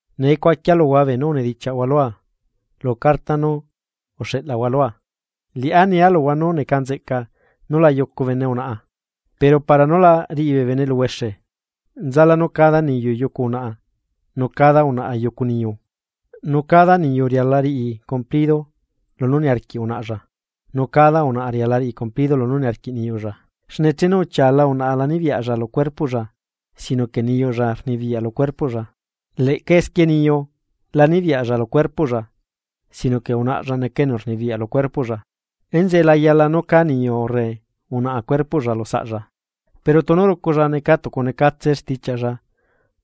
Nee cuaquia luhua beenú unedichiaꞌhua lua lu carta nú uxeꞌlahua lua. Liꞌá nia luhua nú neca nzeꞌca nú la yucu bene unaꞌa. Pero para nú la riꞌi bee bene eluhuexe, nzala nú cada niyu yucu unaꞌa nu cada unaꞌa yucu niyu, nu cada niyu riala riꞌi cumplido lunú niarquiꞌ unaꞌlla nu cada unaꞌa riala riꞌi cumplido lunú niarquiꞌ niyuꞌlla. Xne chenu uchiala unaꞌa la nibiyaꞌlla lu cuerpoꞌlla, sino que niyuꞌlla rnibiyaꞌ lu cuerpoꞌlla. Leꞌca esquie niyu la nibiyaꞌlla lu cuerpoꞌlla, sino que unaꞌlla neca enu rnibiyaꞌ lu cuerpoꞌlla. Enzeꞌe la yala nú cá niyu urre unaꞌa cuerpoꞌlla lu saꞌlla; pero tunu ruculla necatucunecatse stichiaꞌlla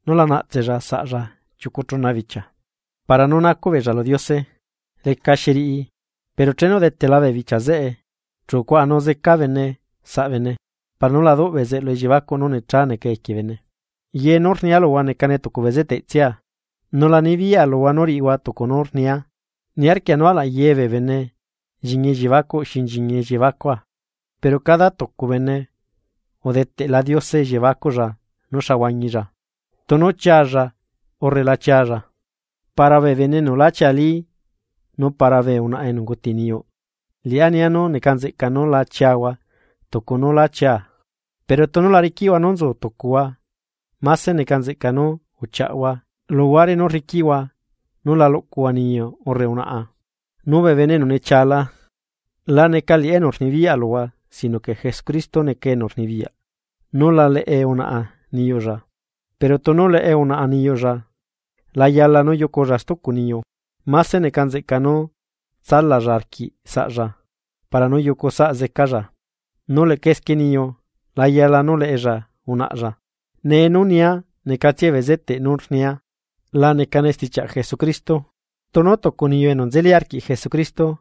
nú la naꞌtsella saꞌlla chiucu chuna bichia, para nú nacuꞌ beella lu Diose. Lecaxi riꞌi pero chenu udetela bee bichia zeꞌe, chu cuaꞌanu zeca bene saꞌ bene, para nú la duꞌ bezeꞌlu elliebacuꞌ nú necha neca equie bene. Ye nú rnia luhua necane tucu bezeteꞌtsia, nu la nibiyaꞌa luhua nú riꞌihua tucu nú rnia. Niarquia nú alaꞌ ye bee bene nchiñi elliebacuꞌ xi nchiñi elliebacua, pero cada tucu bene udeteꞌla Diose elliebacuꞌlla nú xa huañilla, tunu chialla urre la chialla. Para bee bene enu lá chiali nu para bee unaꞌa enu unguti niyuꞌ, liꞌá nia nú neca nzeꞌca nú la chiahua tucu nú lá chiaa. Pero tunu la riquiꞌhua nú nzu tucuhua, máse neca nzeꞌca nú uchiaꞌhua luhuare nú rriquiꞌhua nú la luꞌcuhua niyu urre unaꞌa. Nu bee bene enu nechiala, la neca liꞌá enu rnibiyaꞌ luhua sino que Jesucristo neca enu rnibiyaꞌ nú la leꞌe unaꞌa niyuꞌlla. Pero tunu leꞌe unaꞌa niyuꞌlla la yala nú yuculla stucu niyu, máse neca nzeꞌca nú tsalalla arquiꞌ saꞌlla para nú yucu saꞌzecalla. Nu leꞌca esquie niyu la yala nú leꞌella unaꞌlla. Nee nú nia necatsia bezeteꞌ nú rnia, la necane stichiaꞌ Jesucristo, tunu tucu niyu enu nzeli arquiꞌ Jesucristo,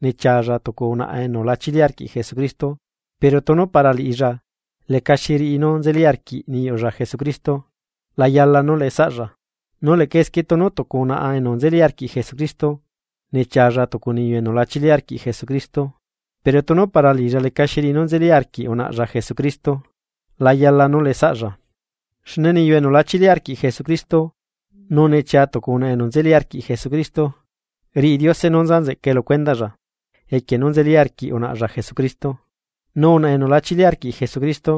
nechialla tucu unaꞌa enu la chili arquiꞌ Jesucristo pero tunu para liꞌilla lecaxi riꞌi nú nzeli arquiꞌ niyuꞌlla Jesucristo la yala nú leꞌe saꞌlla. Nu leꞌca esquie tunu tucu unaꞌa enu nzeli arquiꞌ Jesucristo nechialla tucu niyu enu la chili arquiꞌ Jesucristo, pero tunu para liꞌilla lecaxi riꞌi nú nzeli arquiꞌ unaꞌlla Jesucristo, la yala nú leꞌesaꞌlla. Xne niyu enu la chili arquiꞌ Jesucristo nu nechia tucu unaꞌa enu nzeli arquiꞌ Jesucristo, riꞌi Diose nú nza nzeꞌca lu cuendaꞌlla equie nú nzeli arquiꞌ unaꞌlla Jesucristo, nu unaꞌa enu la chili arquiꞌ Jesucristo,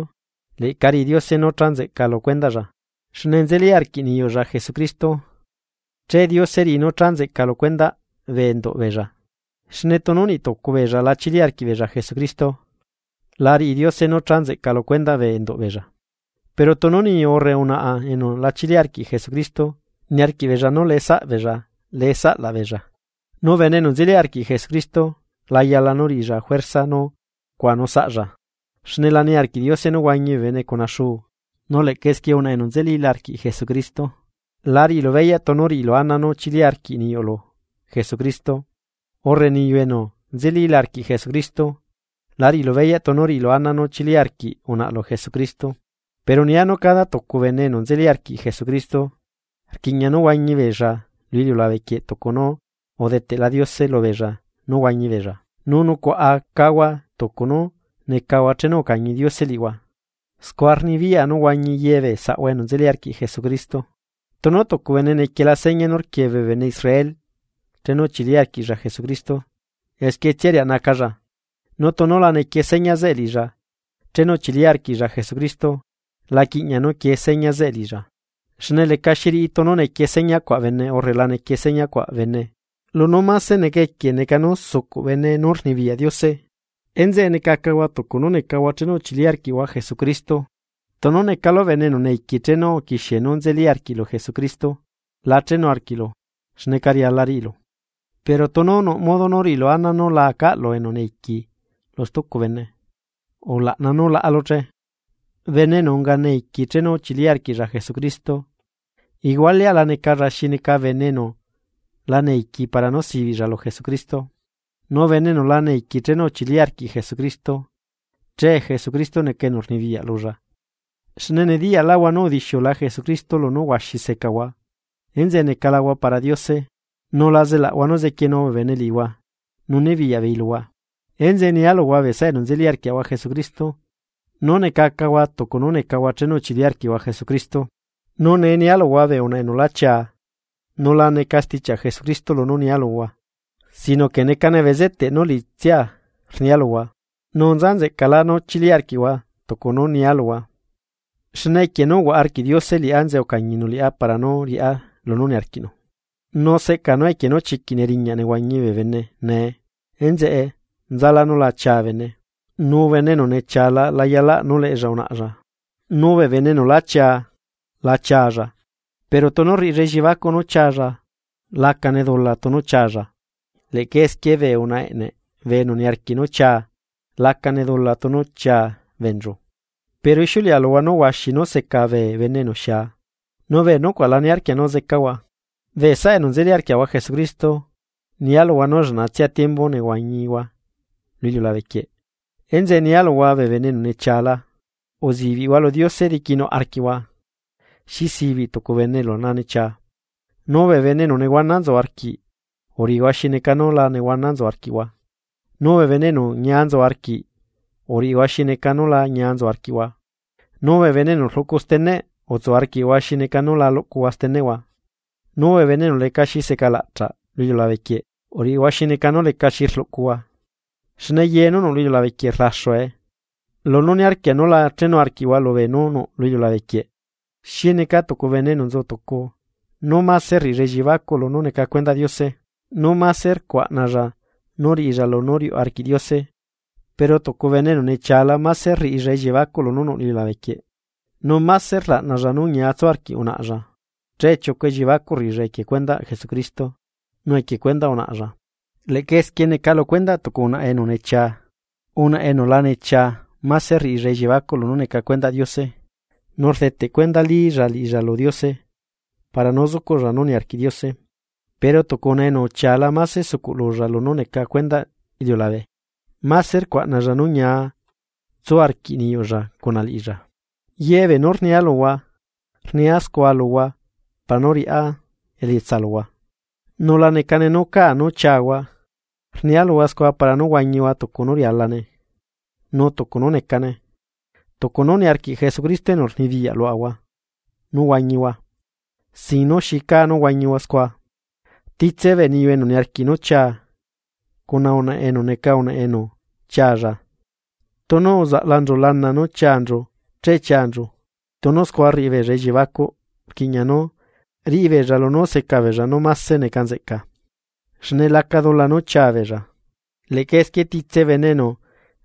leꞌca riꞌi Diose nú cha nzeꞌca lu cuendaꞌlla xne nzeli arquiꞌ niyuꞌlla Jesucristo. Che Diose riꞌi nú cha nzeꞌca lu cuendaꞌ bee enduꞌ beella. Xne tunu niꞌtucu beella la chili arquiꞌbeella Jesucristo, la riꞌi Diose nú cha nzeꞌca lu cuendaꞌ bee enduꞌ beella. Pero tunu niyu urre unaꞌa enu la chili arquiꞌ Jesucristo niarquiꞌ beella nú leꞌe saꞌbeella, leꞌesaꞌlaꞌ beella. Nu bene enu nzeli arquiꞌ Jesucristo la yala nú riꞌilla juerza nú cuaꞌanu saꞌlla, xne la niarquiꞌ Diose nú huañi bee bene cuna xuu. Nu leꞌca esquie unaꞌa enu nzelila arquiꞌ Jesucristo la riꞌilu beyaꞌ tunu riꞌilu ana nú chili arquiꞌ niyuꞌlu Jesucristo, urre niyu enu nzelila arquiꞌ Jesucristo, la riꞌilu beyaꞌ tunu riꞌilu ana nu chili arquiꞌ unaꞌlu Jesucristo. Pero nia nú cada tucu bene enu nzelila arquiꞌ Jesucristo, rquiꞌña nú huañibeella lu iliulabe quieꞌ tucu nú udeteꞌla Diose lubeella nú huañi beella, nu nucuaꞌa cahua tucu nú necahua chenu ucañi Diose liꞌihua. Scua rnibiyaꞌa nú huañi ye bee saꞌahua enu nzeli arquiꞌ Jesucristo. Tunu tucu bene nequiela seña nú rquie bee bene Israel chenu uchili arquiꞌlla Jesucristo, esquietsia riaꞌnacalla. Nu tunu la nequie seña zeꞌe liꞌilla chenu uchili arquiꞌlla Jesucristo la quiꞌñaꞌ nú quie seña zeꞌe liꞌilla. Xne lecaxi riꞌi tunu nequie seña cuaꞌ bene urre la nequie seña cuaꞌ bene, lunú máse neca equie neca nú sucuꞌ bene nú rnibiyaꞌ Diose. Enzeꞌe necacahua tucu nú necahua chenu uchili arquiꞌhua Jesucristo. Tunu necalu esclavo chenu uquixie nú nzeli arquiꞌlu Jesucristo, la chenu arquiꞌlu xneca riala riꞌilu. Pero tunu nuꞌ modo nú riꞌilu ana nú la acaꞌlu esclavoꞌ stucu bene, ulaꞌna nú laꞌalu che. Bene enu unga esclavo chenu uchili arquiꞌlla Jesucristo, igualeaꞌla necalla xi neca bene enu lá aca esclavo para nú sibiꞌlla lu Jesucristo. Nu bene enu la aca esclavo chenu uchili arquiꞌ Jesucristo. Nee enzeꞌe neca xi neca esclavo lu Jesucristo. Xne nediyaꞌlaꞌhua nu udixiula Jesucristo lunú huaxi secahua, enzeꞌe necalahua para Diose. Nu la zelaꞌhua nú zequienu bee bene liꞌihua nu nibiyaꞌbeei luhua. Enzeꞌe nialuhua bee saꞌa enu nzeli arquiaꞌahua Jesucristo, nú necacahua tucu nú necahua chenu uchili arquiꞌhua Jesucristo. Nu nee nia luhua bee unaꞌa enu lá chiaa, nu la neca stichiaꞌ Jesucristo lunú nia luhua. Sino que necane bezeteꞌ nú liꞌitsia rnia luhua, nu nza nzeꞌcalá nú chili arquiꞌhua tucu nú nia luhua, xne equie nú uhuaꞌa arquiꞌ Diose liꞌá enzeꞌe ucañinu liꞌá para nú riꞌá lunú niarquiꞌnu. Nu seꞌca nú equie nú chiquiꞌ neriñaꞌ nehuañi bee bene nee, enzeꞌe nzalá nú la chia bene. Nu bene enu nechiala la yalaꞌ nú leꞌella unaꞌlla. Nu bee bene enu lá chia la chialla. Pero tunu rriꞌilla elliebacuꞌ nú chialla, lacane dula tunu chialla. Leꞌca esquie bee unaꞌa eꞌneꞌ bee enu niarquiꞌ nú chia lacane dula tunu chia beenchu, pero ixiuleꞌa luhua nú huaxi nú seca bee bene enu xia, nu bee nucuaꞌ la niarquia nú zecahua. Bee saꞌa enu nzeli arquiaꞌahua Jesucristo nialuhua nú lleꞌnatsia tiembu nehuañihua lu iliulabe quie, enzeꞌe nia luhua bee bene enu nechiala, uzibiꞌhua lu Diose diquinuꞌ arquiꞌhua xi sibiꞌ tucu bene enu lanechia. Nu bee bene enu nehuana nzu arquiꞌ uriꞌihua xi neca nú la nehuana nzu arquiꞌhua, nu bee bene enu ñia nzu arquiꞌ uriꞌihua xi neca nú la ñia nzu arquiꞌhua, nu bee enu rluꞌcu steneꞌ utsu arquiꞌhua xineca nú la luꞌcuhua steneꞌhua. Nu bee bene enu lecaxi seca laꞌchaꞌ lu iliulabe quieꞌ, uriꞌihua xi neca nú lecaxi rluꞌcuhua, xne ye nú nuꞌ lu iliulabe quieꞌ rlaxue. Lu nú niarquia nú la chenu arquiꞌhua lubee nú nuꞌ lu iliulabe quieꞌ, xi neca tucu bene enu nzu tucu nú máse rriꞌilla elliebacuꞌ lunú neca cuendaꞌ Diose, nu mase rcuaꞌnalla nú riꞌilla lunú riuꞌ arquiꞌ Diose, pero tucu bene enu nechiala máse rriꞌilla elliebacuꞌ lunú nuꞌ lu iliulabe quieꞌ, nu mase rlaꞌnalla nú ñiatsu arquiꞌ unaꞌlla. Che chiucu elliebacuꞌ rriꞌilla equie cuendaꞌ Jesucristo, nu equie cuendaꞌ unaꞌlla. Leꞌca esquie neca lu cuendaꞌ tucu unaꞌa enu nechia, unaꞌa enu la nechia máse rriꞌilla elliebacuꞌ lunú neca lu cuendaꞌ Diose, nu rdeteꞌ cuendalilla liꞌilla lu Diose para nú zucuꞌlla nú niarquiꞌ Diose. Pero tucu unaꞌa enu uchiala máse sucuꞌ lulla lunú neca cuendaꞌ iliulabe, máse rcuaꞌnalla nú ñia tsu arquiꞌ niyuꞌlla cuna liꞌilla. Yebee nú rnia luhua, rnia scua luhua para nú riꞌá elietsa luhua, nu la necane nú caa nú chiahua, rnia luhua scua para nú huañihua tucu nú rialane nu tucu nú necane. Tucu nú niarquiꞌ Jesucristo enu rnibiyaꞌ luaꞌahua nú huañihua, sin nú xi caa nú huañihua scua. Titse bee niyu enu niarquiꞌ nú chia, cuna unaꞌa enu neca unaꞌa enu chialla, tunu uzaꞌlanchu lana nú chianchu che chianchu, tunu scua rriꞌibeella elliebacuꞌ rquiꞌña nú riꞌibeella lunú seca beella nú máse neca nzeꞌca, xne laca dula nú chiabeella. Leꞌca esquie titse bene enu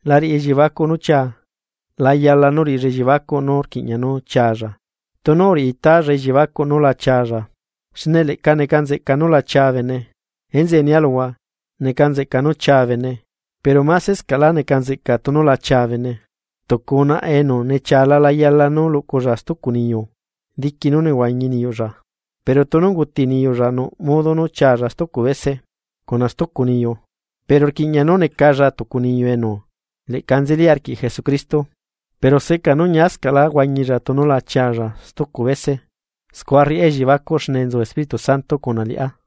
la riꞌi elliebacuꞌ nú chia, layala nú riꞌilla elliebacuꞌ nú rquiꞌña nú chialla, nu tunu uriꞌi italla elliebacuꞌ nú la chialla. Xne leꞌca neca nzeꞌca nú la chia bene. Enzeꞌe nia luhua, neca nzeꞌca nú chia bene, pero másescaꞌla neca nzeꞌca tunu la chia bene. Tucu unaꞌa enu nechiala la yala nú luꞌculla stucu niyu diqui nú nehuañi niyuꞌlla. Pero tunu unguti niyuꞌlla nuꞌ modo chialla stucu bese, cuna stucu niyu pero rquiꞌña nú necalla tucu niyu enu leꞌca nzeli arquiꞌ Jesucristo. Pero seꞌca nú ñiascaꞌla huañilla tunu la chiaꞌlla stucu bese. Scua rriꞌá elliebacuꞌ xne nzu Espíritu Santo cuna liꞌá.